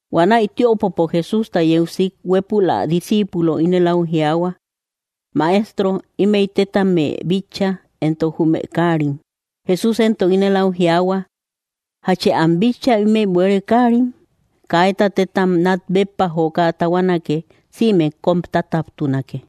Huanäi tiöpopo Jesústa yeu sik, huépul ä discípulo ínel au jiaahua: —¡Maestro, ímëi téttame bitcha éntok jume káarim! Jesús éntok ínel au jiaahua: —¿Jachë am bitcha ímëi bueere káarim? Kaíta téttam nat béppa joka tahuanake sïme kom tataptunake.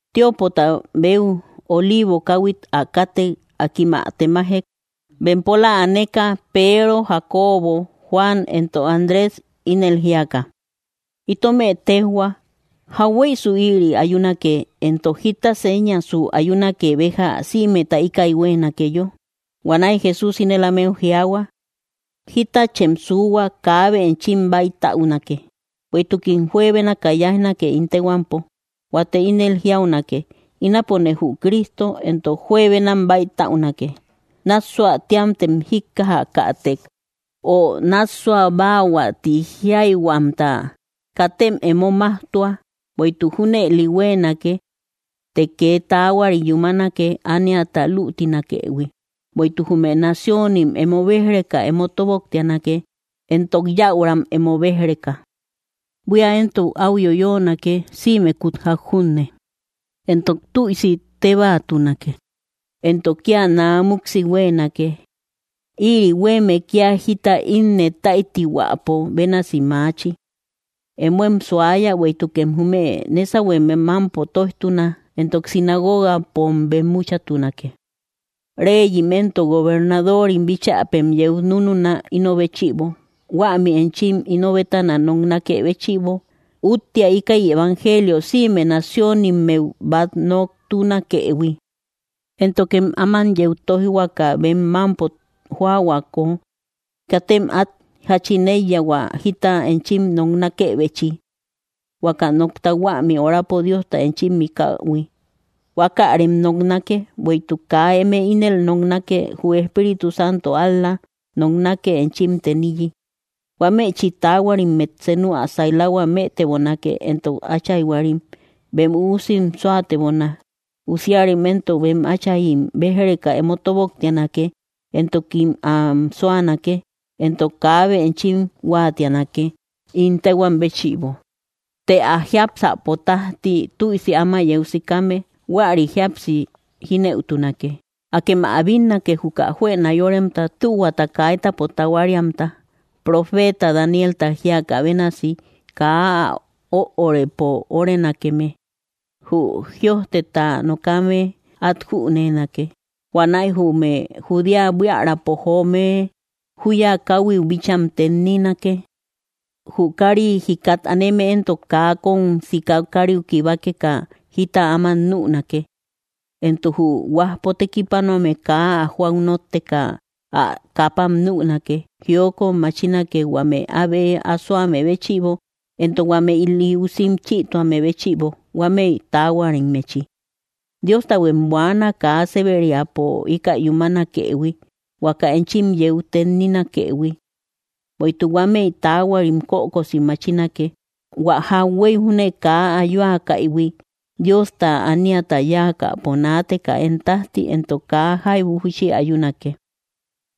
Tiöpota beu Oliivo káuhuit ä kátek, akim ä temajek bempóla aneka Peero, Jacobo, Juan, éntok Andrés, ínel jíaka: —Itómë téjhua, ¿jahueisu ïri ayúnake, éntok jita séñasu ayúnake béja sïmeta íkäi hueenakeyo? Huanäi Jesús ínel ámeu jiaahua: —Jítachem suuhua kaabe enchim bäitäunake. Bueïtukim juebenakä yáijnake ín téhuampo. Huate ínel jíaunake: “Ínapone jü Cristo”; éntok juebenam bäitäunake. ’Nássuahuä téamtem jíkkajätek, o nássuabaahuä tï jíaihuamta, katem emo maujtua, bueïtuk junëli huéenake; teé ke taahuari yumánake ániata luutínakëhui. Bueïtuk jume naciónim, emo béj‑reka emo tóboktianake, éntok yäuram emo béjreka. Buía éntok au yoyóonake sïmekut jak junne; éntok tüisi tébaatunake, éntok kia naa muksi huéenake. Ïri huéeme kia jita innëtáitihuäpo bénasi maachi. ’Émoem suáyä bueïtukem jume nésauhueme mampo tóijtuna, éntok sinagogapom bemmúchatunake. Réyim éntok gobernadórim bíchapem yeu núnuna ino béchiíbo, huämi enchim ino bétana noknákë béchïbo. Uttea íkäi evangelio sïme naciónimmeu bat noktúnakëhui. Éntokem áman yeu tóijhuaka bem mampo jóahuako, katem at jachin eiya hua jita enchim noknakebechi. Huaka nokta huämi orapo Diosta enchim mikähui, huákärem noknake; bueïtuk kaa emé ínel noknake, jü Espíritu Santo ál‑la noknake enchim teniyi. Huámechi taahuarimmet senu ä sailahua mëtebonake, éntok áchaihuarim bem üusim súatebona; usíarim éntok bem atchaim béj‑reka emo tóboktianake, éntokim am súanake. Éntok kaabe enchim huáatianake ín téhuam béchïbo; të ä jiápsäpo tajti tüisi áma yeu sikame, huäri jíapsi jínëutunake. ’Akem ä bínnake juka juëna yóremta tühuata kaitäpo tahuariamta. Profeta Danielta jíakä bénasi kaa ä öorëpo órenakeme —jü jïojteta nokame at jünenake—, huanäi jume Judéa buíaräpo joome juya kauhuiu bícham tenninake. Jü kari jikat aneme éntok kaa kóm sika kariu kibákeka jita áma nünake; éntok jü huajpo tékipanoame kaa ä joau nótteka ä kaapam nünake. Jiokot machínake huame abe asoame béchïbo, éntok huame ili ússim chïtuame béchïbo huámëi taahuarimmechi. Dióstahuem buaana kaa séberiapo íkäi yumánakëhui huaka enchim yeu tennínakëhui. Bueïtuk huámëi taahuarim kökosi machínake, hua jakhuéi júne kaa ayúakaïhui Diosta ániata yáakäpo naateka én tajti, éntok kaa jaibu júchi ayúnake.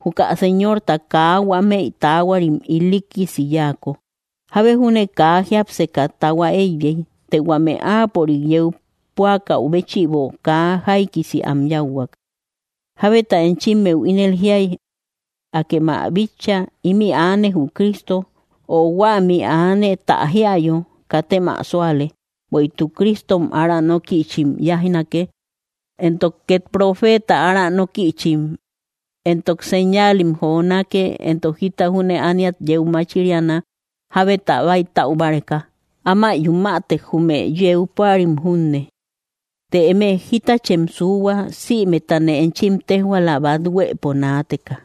Juka Señorta kaa huámëi taahuarim ilíikisi yáako, jábe júne kaa jiápseka tahua eiyei. Të huame áapörik yeu púakäu béchïbo kaa jáikisi am yáuhuak. ’Jábeta enchimeu ínel jíai: “Akema bitcha, ímï aane jü Cristo”, o “Huämi aane ta jíayo, katem ä súale.” Bueïtuk Cristom ára nókïchim yáijnake, éntok ket profeta aranókïchim, éntok señáalim jonake éntok jita júne ániat yeu machíriana jábeta bäitäu báreka, áma yumätek jume yeu púarim junne. Të eme, jitachem suuhua; sïmetane enchim téjhuala bat huëpo naateka.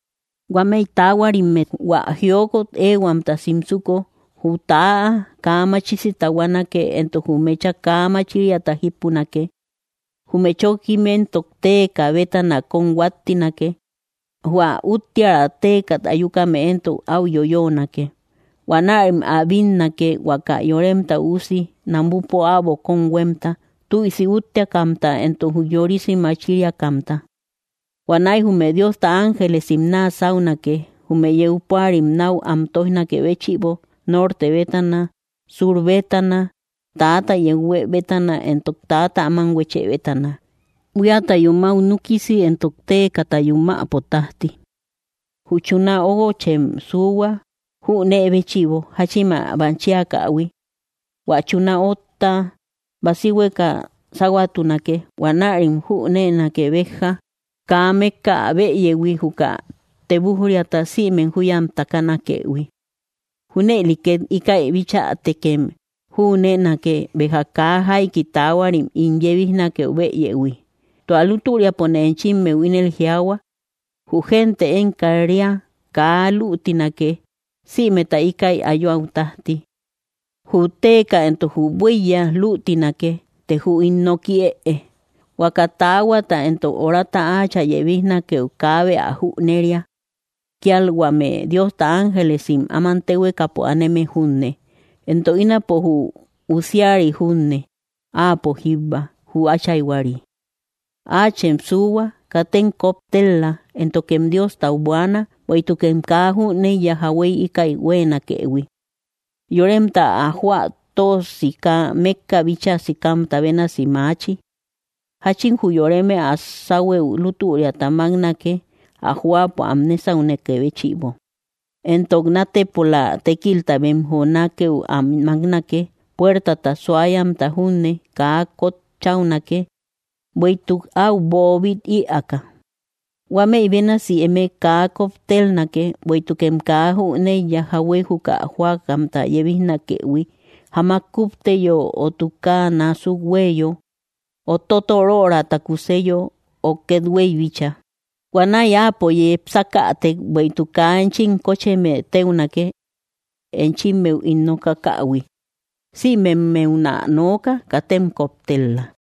’Huámëi taahuarimmet hua jiokot éehuamta simsuko, jü täa kaa machisi tahuánake éntok jü meecha kaa machíriata jípunake; jume chókkim éntok téeka bétana kóm huáttinake; hua útteara téekat ayúkame éntok au yoyóonake. Huanärim ä bínnake huaka Yoremta Üusi namupo äbo kóm huemta, tüisi útteakamta éntok ujyorisi machíriakamta. Huanäi jume Diosta ángelesim naa sáunake jume yeu púarim nau am tóijnakë béchïbo norte bétana, sur bétana, täata yeu huë bétana, éntok täata áman huechë bétana, buíata yumäu núkisi éntok téekata yumäpo tajti. ’Jü chuná óuguochem suuhua jünee béchïbo jachin ä machíakähui: hua chuná otta basíhueka sáhuatunake, huanärem jünéenake béja kaa mékka ä bëyehui juka tebujriata sïme juyam takanakëhui. Júnëli ket íkäi bichätekem jünéenake béja kaa jaiki taahuarim ín yebíjnakeu bëyehui. Tua lútüriapone enchimeu ínel jiaahua, jü gente én kat‑ria kaa luutínake sïmeta íkäi ayuäu tajti. Jü téeka éntok jü buíya luutínake, të jü ín nooki ëe. ’Huaka taahuata éntok orata áachä yebíjnakeu kaabe ä jüneria; kial huame Diosta ángelesim áman téhuekapo aneme junne, éntok ínapo jü Usíari junne. Áapo jíbba, jü áchaihuari. ’Áachem suuhua, katem koptel‑la, éntokem Diostau buaana, bueïtukem kaa jüneiya jahuéi íkäi hueenakëhui. Yoremta ä jóa tö sika mékka bíchaa sikamta bénasi maachi; jachin jü yoreme ä sáhuëu lútüriata máknake ä jóapo am nésaunakë béchïbo, éntok nátepola tékilta bem jonákëu am máknake; puértata suáyamta junne kaa kotcháunake, bueïtuk au boobit ïaaka. Huámëi bénasi emé kaa koptélnake, bueïtukem kaa jüneiya jahuéi juka jóakamta yebíjnakëhui, jamak kúpteyo, o tukáa násuk huéeyo, o totorörata kuseyo, o kethueï bíchaa; Huanäi Áapo yepsákätek bueïtuk kaa enchim kócheme téunake. Enchimmeu ín nokákähui sïmemmeunä nooka: katem koptel-la.